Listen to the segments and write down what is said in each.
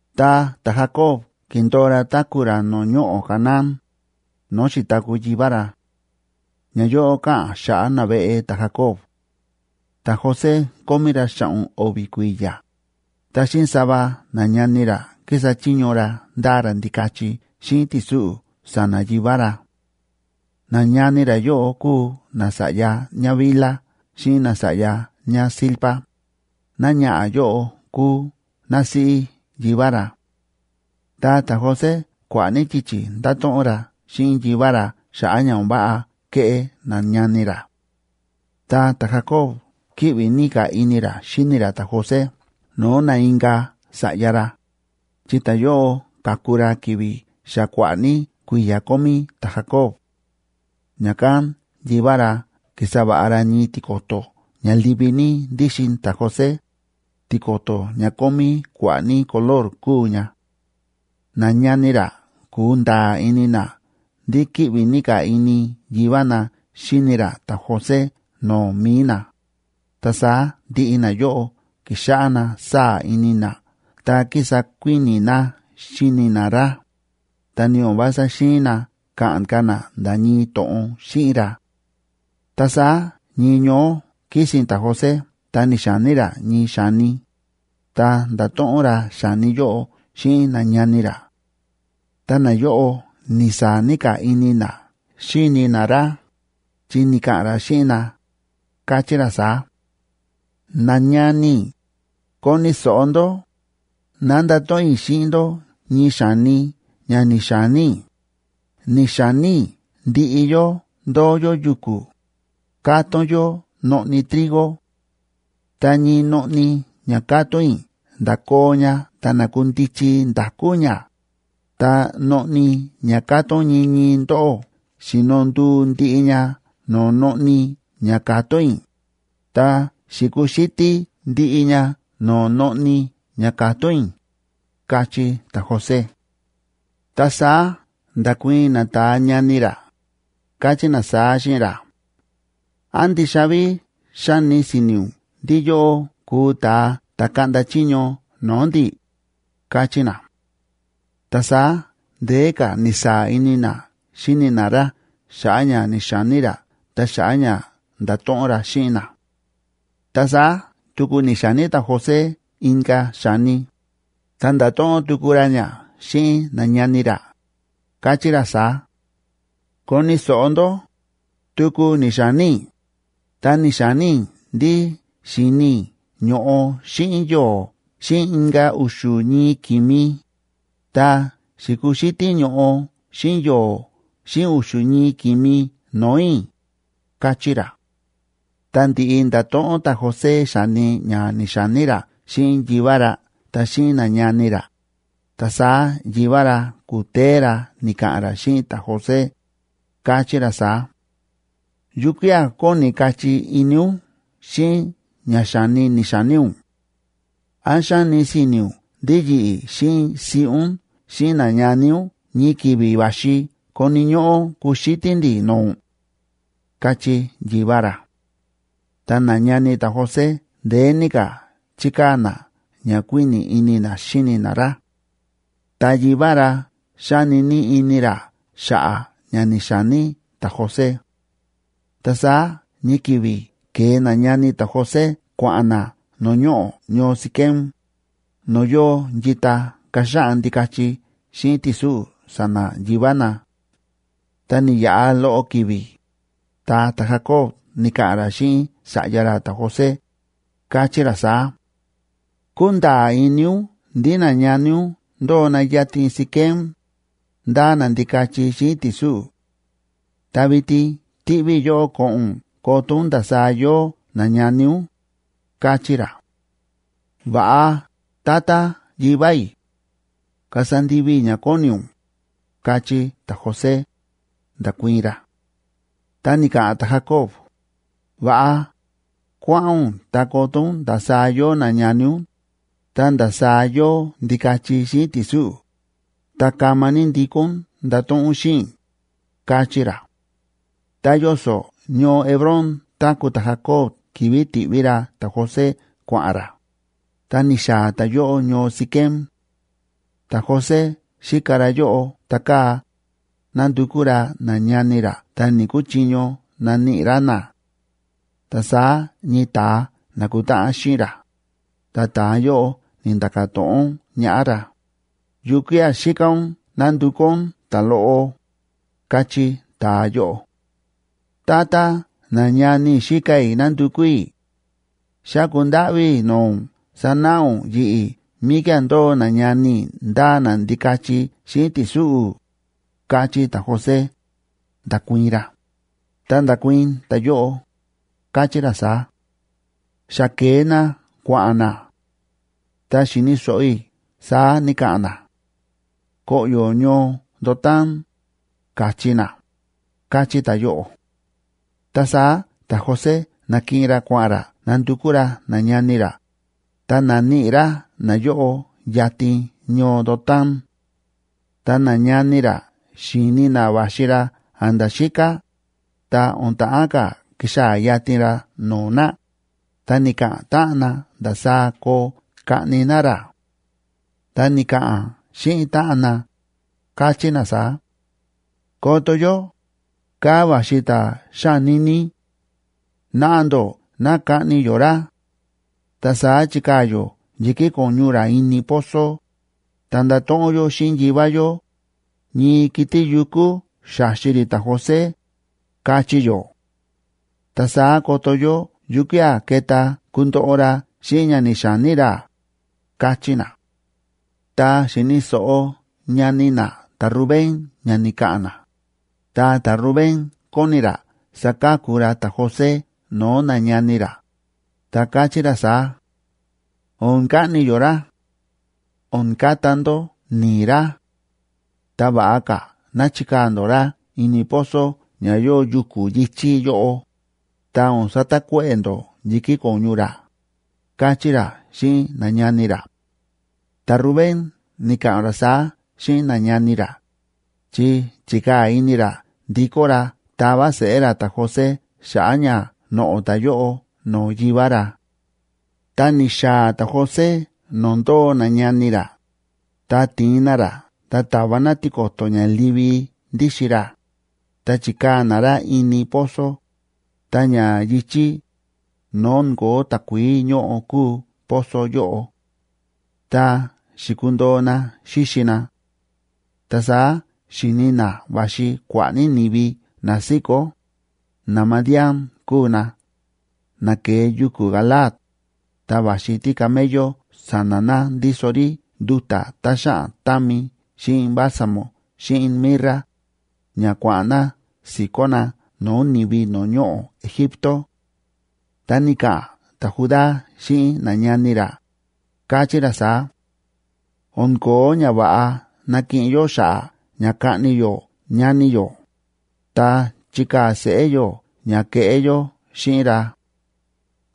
Ta ta̱Jacob ki̱ndo̱o ra táku̱ ra no̱o̱ ñoꞌo̱ Canaán, no̱o̱ xi̱taku̱ yivá ra. Ñayóꞌo káꞌa̱n xa̱ꞌa̱ naveꞌe ta̱Jacob. Ta̱José kómí ra xa̱ꞌo̱n o̱vi̱ kui̱ya̱, ta xíꞌin sava nañani ra kísa chiño ra ndáa ra ndikachi xíꞌin ti̱súꞌu̱ sa̱na̱ yivá ra; nañani ra yóꞌo kúu nasa̱ꞌya ñáBilha xíꞌin nasa̱ꞌya ñáZilpa, náñaꞌa̱ yóꞌo kúu násíꞌí yivá ra. Ta ta̱José kua̱ꞌa̱ ní yichi̱ ndáto̱ꞌon ra xíꞌin yivá ra xa̱ꞌa̱ ña o̱n váꞌa kéꞌé nañani ra. Ta ta̱Jacoba kíꞌvi ní ka̱ ini ra xíni ra ta̱José no̱o̱ na inka̱ sa̱ꞌya ra, chi ta̱yóꞌo ka̱ku ra ki̱vi̱ xa kua̱ꞌa̱ ní kui̱ya̱ kómí ta̱Jacob. Ña̱kán yivá ra ki̱sa va̱ꞌa ra ñii tiko̱to̱ ña livi ní ndíxin ta̱José, tiko̱to̱ ña kómí kua̱ꞌa̱ ní color kúu ña. Nañani ra ku̱nda̱a̱ ini na ndí kíꞌvi ní ka̱ ini yivá na xíni ra ta̱José no̱o̱ mi̱i na, ta saá ndiꞌi nayóꞌo ki̱xáꞌá na sáa̱ ini na ta kísa kuíni̱ na xíni na ra, ta ni o̱n vása xi̱in na ka̱ꞌa̱n ka̱ na nda̱ ñii to̱ꞌon xíꞌin ra. Ta saá ñii ñoó kísi̱n ta̱José ta ni̱xa̱ní ra ñii xa̱ni, ta nda̱to̱ꞌon ra xa̱ni yóꞌo xíꞌin nañani ra; ta nayóꞌo ni̱saa̱ ní ka̱ ini na xíni na ra, chi ni̱ka̱ꞌa̱n ra xíꞌin na, káchí ra saá: ―Nañani i̱, koni̱ so̱ꞌo ndó, ná ndato̱ꞌon i̱ xíꞌin ndó ñii xa̱ni ña ni̱xa̱ní i̱. Ni̱xa̱ní i̱ ndiꞌi yó ndóo yó yuku̱, kátón yó noꞌni trigo; ta ñii noꞌni ña ka̱tón i̱ nda̱koo ña ta na̱kundichi nda̱kú ña, ta noꞌni ña ka̱tón ñii ñii ndóꞌó xi̱no nduu ndiꞌi ña no̱o̱ noꞌni ña ka̱tón i̱, ta xi̱kuxítí ndiꞌi ña no̱o̱ noꞌni ña ka̱tón i̱ ―káchí ta̱José. Ta saá nda̱kuii̱n nata̱a ñani ra, káchí na saá xíꞌin ra: ―¿Án ndixa ví xáni si̱ni̱ ún ndí yóꞌó kuu ta̱a ta̱ kaꞌnda chiño no̱o̱ ndi̱? ―káchí na. Ta saá ndeé ka̱ ni̱saa̱ ini na xíni na ra xa̱ꞌa̱ ña ni̱xa̱ní ra ta xa̱ꞌa̱ ña nda̱to̱ꞌon ra xíꞌin na. Ta saá tuku ni̱xa̱ní ta̱José inka̱ xa̱ni, ta nda̱to̱ꞌon tuku ra ña xíꞌin nañani ra, káchí ra saá: ―Koni̱ so̱ꞌo ndó, tuku ni̱xa̱ní i̱, ta ni̱xa̱ní i̱ ndí xi̱ni i̱ ño̱ꞌo xíꞌin yo̱o̱ xíꞌin inka̱ u̱xu̱ ñii ki̱mi, ta xi̱kuxítí ño̱ꞌo xíꞌin yo̱o̱ xíꞌin u̱xu̱ ñii ki̱mi no̱o̱ i̱ ―káchí ra. Ta ndi̱ꞌi nda̱to̱ꞌon ta̱José xa̱ni ña ni̱xa̱ní ra xíꞌin yivá ra ta xíꞌin nañani ra, ta saá yivá ra ku̱téé ra ni̱ka̱ꞌa̱n ra xíꞌin ta̱José, káchí ra saá: ―¿Yukía̱ kóni kachí ini ún xíꞌin ña xa̱ni ni̱xa̱ní ún? ¿Án xáni si̱ni̱ ún ndí yi̱ꞌi̱ xíꞌin siꞌí ún xíꞌin nañani ún ñii ki̱vi̱ va̱xi koni̱ ñóꞌó kuxítí ndi̱ no̱o̱ ún? ―káchí yivá ra. Ta nañani ta̱José ndeé ní ka̱ chíkaa̱ na ña kuíni̱ ini na xíni na ra; ta yivá ra xáni ní ini ra xa̱ꞌa̱ ña ni̱xa̱ní ta̱José. Ta saá ñii ki̱vi̱ ke̱e nañani ta̱José kua̱ꞌa̱n na no̱o̱ ñoꞌo̱ ñoo Siquem, no̱o̱ yóo yita kaxaꞌan ndikachi xíꞌin ti̱súꞌu̱ sa̱na̱ yivá na. Ta ni̱yaꞌa loꞌo ki̱vi̱, ta ta̱Jacob ni̱ka̱ꞌa̱n ra xíꞌin sa̱ꞌya ra ta̱José, káchí ra saá: ―Kúnda̱a̱ ini ún ndí nañani ún ndóo na yatin Siquem, ndáa na ndikachi xíꞌin ti̱súꞌu̱. Ta vitin tiꞌví i̱ yóꞌó ko̱ꞌo̱n ún koto ún ndasaá yóo nañani ún ―káchí ra. ―Va̱ꞌa, tata yivá i̱, kasa ndivi i̱ ña kóni ún ―káchí ta̱José, nda̱kuii̱n ra. Ta ni̱ka̱ꞌa̱n ta̱Jacob: ―Va̱ꞌa, kuáꞌa̱n ún ta koto ún ndasaá yóo nañani ún, ta ndasaá yóo ndikachi xíꞌin ti̱súꞌu̱, ta kama ní ndikó ún ndato̱ꞌon ún xíꞌin i̱ ―káchí ra. Ta yoso̱ ñoo Hebrón táku̱ ta̱Jacob ki̱vi̱ ti̱ꞌví ra ta̱José kua̱ꞌa̱n ra, ta ni̱xaa̱ ta̱yóꞌo ñoo Siquem. Ta̱José xíka ra yóꞌo ta kaa̱, nándukú ra nañani ra ta ni̱‑kuchiño naníꞌi ra na. Ta saá ñii ta̱a na̱kutáꞌan xíꞌin ra, ta ta̱a yóꞌo ni̱nda̱ka̱ to̱ꞌon ñaꞌá ra: ―¿Yukía̱ xíka ún nándukú ún?, ta̱loꞌo ―káchí ta̱a yóꞌo. ―Tata, nañani i̱ xíka i̱ nándukú i̱. Xáku ndáꞌví i̱ no̱o̱ ún sanáꞌa ún yi̱ꞌi̱ míkía̱ ndóo nañani i̱ ndáa na ndikachi xíꞌin ti̱súꞌu̱ ―káchí ta̱José, nda̱kuii̱n ra. Ta nda̱kuii̱n ta̱yóꞌo, káchí ra saá: ―Xa ke̱e na kua̱ꞌa̱n na. Ta xi̱ni̱ so̱ꞌo i̱ saá ni̱ka̱ꞌa̱n na: “Koꞌyo̱ ñoo Dotán”, ka̱chí na ―káchí ta̱a yóꞌo. Ta saá ta̱José na̱kiꞌin ra kua̱ꞌa̱n ra nandukú ra nañani ra, ta na̱níꞌi ra nayóꞌo yatin ñoo Dotán. Ta nañani ra xi̱ni na va̱xi ra a̱nda̱ xíká, ta o̱n ta̱ꞌán ka̱ kixaa̱ yatin ra no̱o̱ na, ta ni̱ka̱ꞌa̱n táꞌan na ndasaá koo kaꞌni na ra. Ta ni̱ka̱ꞌa̱n xíꞌin táꞌan na, káchí na saá: ―¡Koto yó, kaa̱ va̱xi ta̱ xání ní! Naꞌa ndó ná kaꞌni yó ra; ta saá chikaa̱ yó yi̱kí ko̱ñu ra ini pozo, ta ndato̱ꞌon yó xíꞌin yivá yó: “Ñii kiti̱ yukú xa̱xi rí ta̱José”, kachí yó. ¡Ta saá koto yó yukía̱ keta kundoꞌo ra xíꞌin ña ni̱xa̱ní ra! ―káchí na. Tá xi̱ni̱ so̱ꞌo ñani na ta̱Rubén ña ni̱ka̱ꞌa̱n na, ta ta̱Rubén kóni ra saka̱ku ra ta̱José no̱o̱ nañani ra, ta káchí ra saá: ―O̱n kaꞌni yó ra. O̱n kata ndó ni̱i̱ ra. Ta va̱ꞌa ka̱ ná chikaa̱ ndó ra ini pozo ña yóo yuku̱ yi̱chí yóꞌo, ta o̱n satakuéꞌe̱ ndó yi̱kí ko̱ñu ra ―káchí ra xíꞌin nañani ra. Ta̱Rubén ni̱ka̱ꞌa̱n ra saá xíꞌin nañani ra, chi chi̱kaa̱ ini ra ndikó ra tava seꞌé ra ta̱José xa̱ꞌa̱ ña noꞌo̱ ta̱yóꞌo no̱o̱ yivá ra. Tá ni̱xaa̱ ta̱José no̱o̱ ndóo nañani ra, ta ti̱in na ra ta ta̱va na tiko̱to̱ ña livi ndíxin ra, ta chi̱kaa̱ na ra ini pozo, ta ña yi̱chí, no̱o̱ o̱n ko̱ó takuií ñóꞌo kúu pozo yóꞌo. Ta xi̱kundo̱o na xíxi na. Ta saá xi̱ni na va̱xi kua̱ꞌa̱ ní ni̱vi na síkó, naMadiánb kúu na, na ke̱e yuku̱ Galaad, ta va̱xi tícamello sa̱na̱ na ndíso rí nduta̱ tá xáꞌan támi xíꞌin bálsamo xíꞌin mirra, ña kua̱ꞌa̱n na si̱kó na no̱o̱ ni̱vi no̱o̱ ñoꞌo̱ Egipto. Ta ni̱ka̱ꞌa̱n ta̱Judá xíꞌin nañani ra, káchí ra saá: ―O̱n ko̱ó ñava̱ꞌa nakiꞌin yó xa̱ꞌa̱ ña kaꞌni yó ñani yó, ta chikaa̱ seꞌé yó ña ke̱ꞌé yó xíꞌin ra.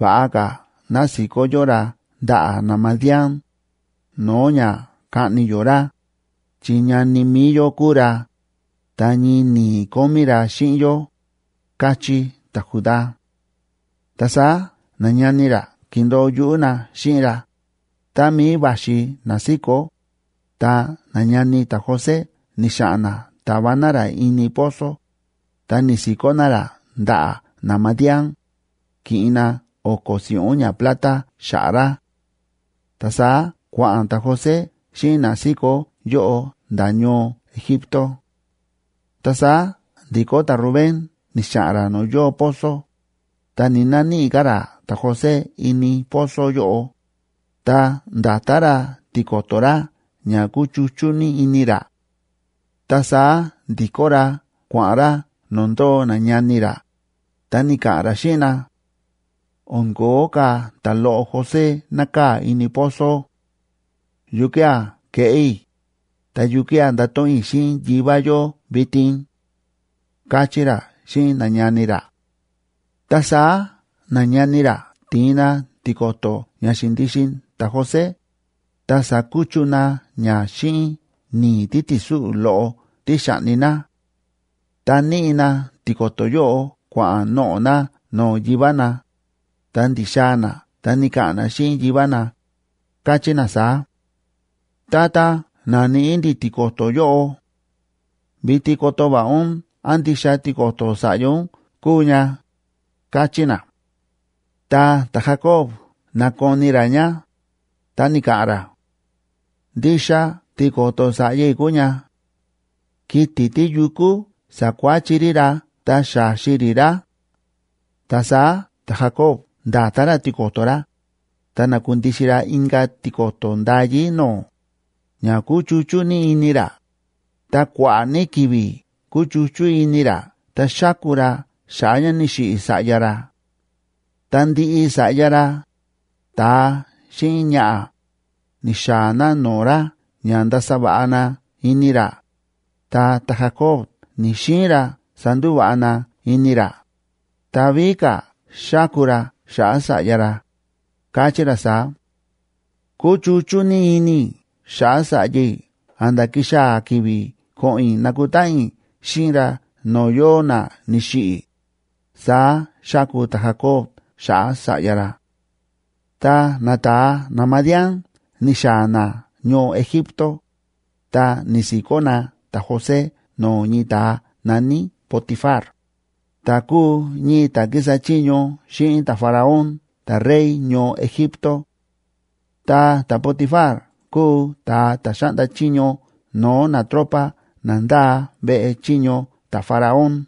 Va̱ꞌa ka̱ ná si̱kó yó ra ndaꞌa̱ naMadián, no̱o̱ ña kaꞌni yó ra, chi ñani mi̱i yó kúu ra, ta ñii ni̱i̱ kómí ra xíꞌin yó ―káchí ta̱Judá. Ta saá nañani ra ki̱ndo̱o yuꞌú na xíꞌin ra, tá mií va̱xi na síkó, ta nañani ta̱José ni̱xa̱ꞌa̱n na ta̱va na ra ini pozo, ta ni̱si̱kó na ra ndaꞌa̱ naMadián, ki̱ꞌin na o̱ko̱ si̱ꞌún ñaplata xa̱ꞌa̱ ra. Ta saá kua̱ꞌa̱n ta̱José xíꞌin na síkó yóꞌo nda̱ ñoo Egipto. Ta saá ndi̱kó ta̱Rubén ni̱xa̱ꞌa̱n ra no̱o̱ yóo pozo, ta ni̱‑naníꞌi ka̱ ra ta̱José ini pozo yóꞌo, ta nda̱ta ra tiko̱to̱ ra ña kúchuchú ní ini ra. Ta saá ndi̱kó ra kua̱ꞌa̱n ra no̱o̱ ndóo nañani ra, ta ni̱ka̱ꞌa̱n ra xíꞌin na: ―¡O̱n ko̱ó ka̱ ta̱loꞌo José nákaa̱ ini pozo! ¿Yukía̱ keꞌé i̱, ta yukía̱ ndato̱ꞌon i̱ xíꞌin yivá yó vitin? ―káchí ra xíꞌin nañani ra. Ta saá nañani ra ti̱in na tiko̱to̱ ña xi̱ndixin ta̱José, ta sa̱kuchu na ña xíꞌin ni̱i̱ títi̱súꞌu̱ loꞌo tí xa̱ꞌni na; ta níꞌi na tiko̱to̱ yóꞌo kua̱ꞌa̱n noꞌo̱ na no̱o̱ yivá na, ta ndi̱xaa̱ na ta ni̱ka̱ꞌa̱n na xíꞌin yivá na, káchí na saá: ―Tata, na̱níꞌi ndi̱ tiko̱to̱ yóꞌo. Vitin koto va̱ꞌa ún án ndixa tiko̱to̱ sa̱ꞌya ún kúu ña ―káchí na. Ta ta̱Jacob na̱koni ra ña, ta ni̱ka̱ꞌa̱n ra: ―¡Ndixa tiko̱to̱ sa̱ꞌya i̱ kúu ña! ¡Kiti̱ tíyukú sa̱kuáchi rí ra ta xa̱xi rí ra! Ta saá ta̱Jacob nda̱ta ra tiko̱to̱ ra, ta na̱kundixin ra inka̱ tiko̱to̱ ndayí no̱o̱, ña kúchuchú ní ini ra, ta kua̱ꞌa̱ ní ki̱vi̱ kúchuchú ini ra ta xáku ra xa̱ꞌa̱ ña ni̱xiꞌi̱ sa̱ꞌya ra. Ta ndiꞌi sa̱ꞌya ra, ta̱a xíꞌin ñaꞌa̱, ni̱xaa̱ na no̱o̱ ra ña ndasa va̱ꞌa na ini ra, ta ta̱Jacob ni̱‑xiin ra sandúva̱ꞌa na ini ra, ta víꞌí ka̱ xáku ra xa̱ꞌa̱ sa̱ꞌya ra, káchí ra saá: ―Kuchuchú ní ini i̱ xa̱ꞌa̱ sa̱ꞌya i̱ a̱nda̱ kixaa̱ ki̱vi̱ ko̱ꞌo̱n i̱ nakutáꞌan i̱ xíꞌin ra no̱o̱ yóo na ni̱xiꞌi̱ ―saá xáku ta̱Jacob xa̱ꞌa̱ sa̱ꞌya ra. Tá nata̱a naMadián ni̱xaa̱ na ñoo Egipto, ta ni̱si̱kó na ta̱José no̱o̱ ñii ta̱a na̱ní Potifar, ta̱ kúu ñii ta̱ kísa chiño xíꞌin ta̱Faraón ta̱rey ñoo Egipto. Ta ta̱Potifar kúu ta̱a ta̱ xáꞌnda chiño no̱o̱ natropa na ndáa veꞌe chiño ta̱Faraón.